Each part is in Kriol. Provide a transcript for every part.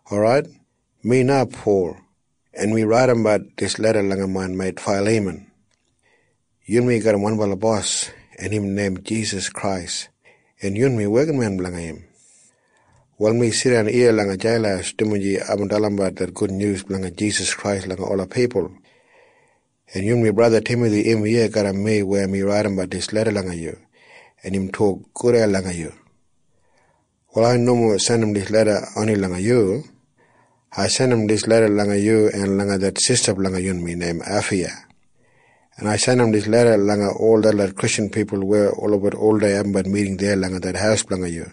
Orait, mi na Pol, en mi raidimdan leda langa main meit Failiman. Yunmi garram wanbala Bos, en im neim Jisas Krais, en yunmi wekinmen blanga im. Wal mi jidan iya langa jeil, dumaji aibin dalimbat det gudnyus blanga Jisas Krais langa ola pipul. En yunmi braja Timathi, im iya garram mi weya mi raidimbat dijan leda langa yu, en im tok gudei langa yu. Wal ai nomo jandim dijan leda oni langa yu. Ai jandim dijan leda langa yu en langa det sista blanga yunmi du, neim Afaiya, en ai jandim dijan leda langa ol detlot Kristjan pipul weya oldei abumbat miting deya langa det haus blanga yu,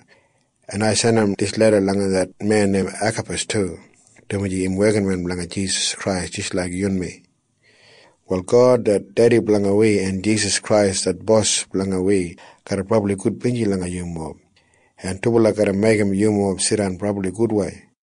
en ai jandim dijan leda langa det men neim Akapas du, dumaji im wekinmen blanga Jisas Krais jis laik yunmi. Wal God det Dedi blanga wi en Jisas Krais det Bos blanga wi garra brabli kainbala langa yumob, en dubala garra meigim yumob jidan brabli gudwei.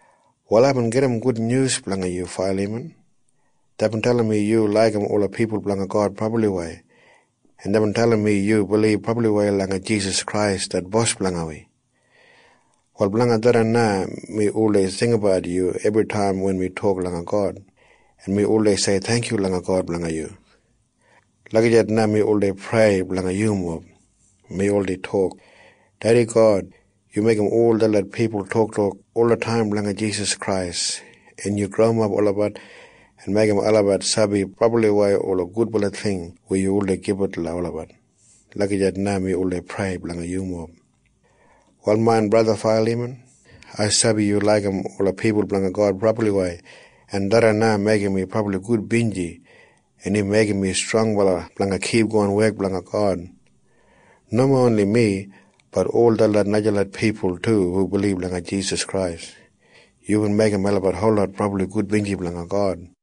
Wal aibin gedim gudnyus blanga yu, Failiman. Deibin dalim mi yu laigim ola pipul blanga God brabliwei, en deibin dalim mi yu bilib brabliwei langa Jisas Krais det Bos blanga wi. Wal blanga tharran na mi oldei jinggabat yu ebritaim wen mi tok langa God, en mi oldei sei theingkyu langa God blanga yu. Prayer Lagijat na mi oldei prei blanga yumob, “Dedi God, yu meigim ol detlot pipul toktok olataim blanga Jisas Krais, en yu growimap olabat en meigim olabat sabi brabliwei ola gudbala ting weya yu oldei gibit olabat.” Lagijat na mi oldei prei blanga yumob. Wal main braja Failiman, ai sabi yu laigim ola pipul blanga God brabliwei, en tharran na meigim mi brabli gudbinji, en im meigim mi strongbala blanga kipgon wek blanga God. Nomo oni mi, bat ol detlot najalot pipul du hu bilib langa Jisas. Yubin meigim melabat holot brabli gudbinji blanga God.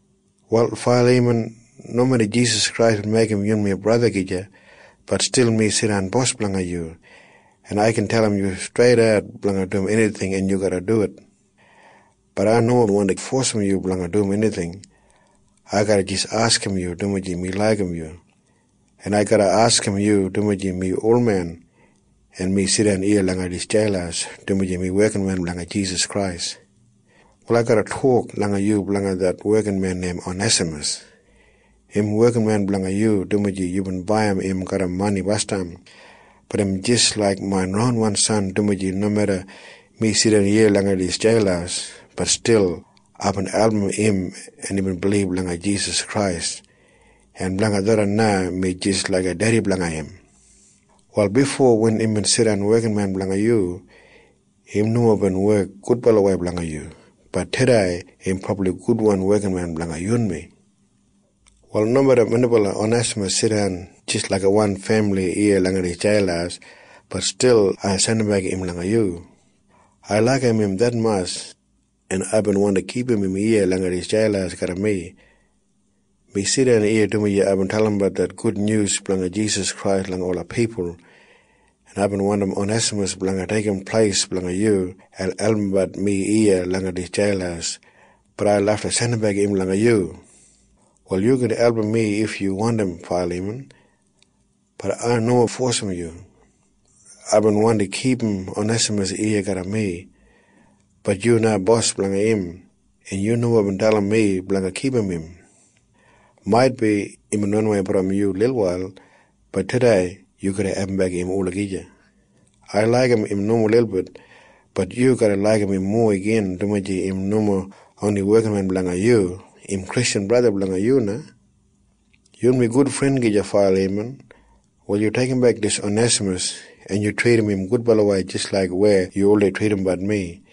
Wal Failiman, nomeda Jisas Krais bin meigim yunmi braja gija, bat stil mi jidan bos blanga yu, en ai gin dalim yu streidat blanga dum enijing, en yu garra dum. Bat ai nomo wandim fosim yu blanga dum enijing. Ai garra jis askim yu, dumaji mi laigim yu. En ai garra askim yu, dumaji mi olmen, en mi jidan iya langa dijan jeil, dumaji mi wekinmen blanga Jisas Krais. Wal ai garra askim yu blanga yu wekinmen neim Onesamas, dumaji yubin baiyim im garram mani basdam. Bat im jis laik main ronwan san, dumaji nomeda mi jidan iya langa dijan jeil, bat stil aibin album im, en imbin bilib langa Jisas Krais. En blanga tharran na mi jis laiga dedi blanga im. Wal bifo wen imbin jidan wekinmen blanga yu, im nomo bin wek gudbalawei blanga yu. Bat tudei im brabli gudwan wekinmen blanga yunmi. Wal nomeda minbala Onesamas jidan jis laiga wan femili iya langa dijan jeil, bat stil ai garra jandimbek im langa yu. Ai laigim im detmatj, en aibin wandi kipum im iya langa dijan jeil garram mi. Mi jidan iya, dumaji aibin dalimbat det gudnyus blanga Jisas Krais langa ola pipul, en aibin wandim Onesamas blanga deigim pleis blanga yu en albumbat mi iya langa dijan jeil, bat ai lafta jandimbek im langa yu na. Wal yu gin album mi if yu wandim, Failiman. Bat ai nomo fosim yu. Aibin wandi kipum Onesamas iya garram mi. Bat yu na bos blanga im, en yu nomo bin dalim mi blanga kipum im. Bifo imbin ranawei brom yu lilwail, bat tudei na yu garra abumbek im olagija. Ai laigim im nomo lilbit. Bat yu garra laigim im mowa igin, dumaji im nomo oni wekinmen blanga yu. Im Kristjan braja blanga yu na. Failiman, yunmi gud fren. Wal yu deigimbek Onesamas, en yu tridim im gudwei jis laik yubin tridim mi.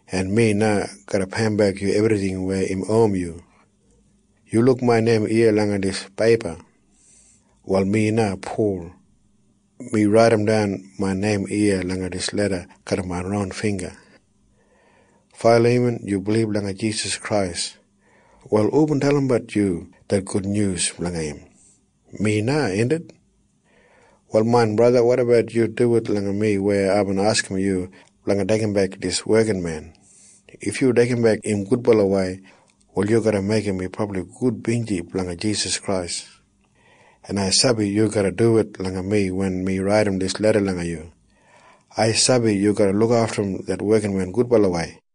en ai garra peiyimbek yu ebrijing weya im owim yu. Yu luk main neim iya langa dijan peipa? Wal mi na, Pol, mi raidimdan main neim iya langa dijan leda garram main ron bingga. Failiman, yu bilib langa Jisas Krais. Wal hubin dalimbat yu det gudnyus blanga im? Mi na, indit? Wal main braja, wotabat yu duwit langa mi weya aibin askim yu blanga deigimbek yu wekinmen. If yu deigimbek im gudwei, wal yu garra meigim mi brabli gudbinji blanga Jisas Krais. En ai sabi yu garra duwit langa mi wen mi jandim dijan leda langa yu. Ai sabi yu garra lukaftumbat det wekinmen gudwei.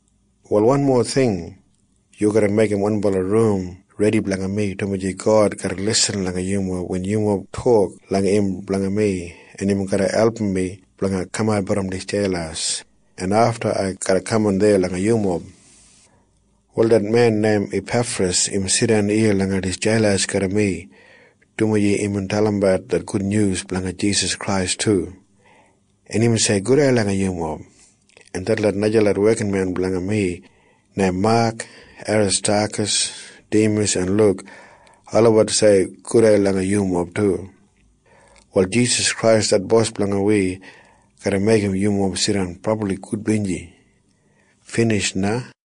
Wal wanmo ting. Yu garra meigim wanbala rum redi blanga mi, dumaji God garra lisin langa yumob wen yumob tok langa im blanga mi, en im garra album mi blanga kamat brom dijan jeil, en afta ai garra kaman deya langa yumob. Wal det men neim Apefras im jidan iya langa dijan jeil garram mi, dumaji imbin dalimbat det gudnyus blanga Jisas Krais du. En im sei gudei langa yumob. En detlot najalot wekinmen blanga mi neim Mak, Aristakas, Dimas en Luk, olabat sei gudei langa yumob du. Wal Jisas Krais det Bos blanga wi garra kain langa yumob. Binij na.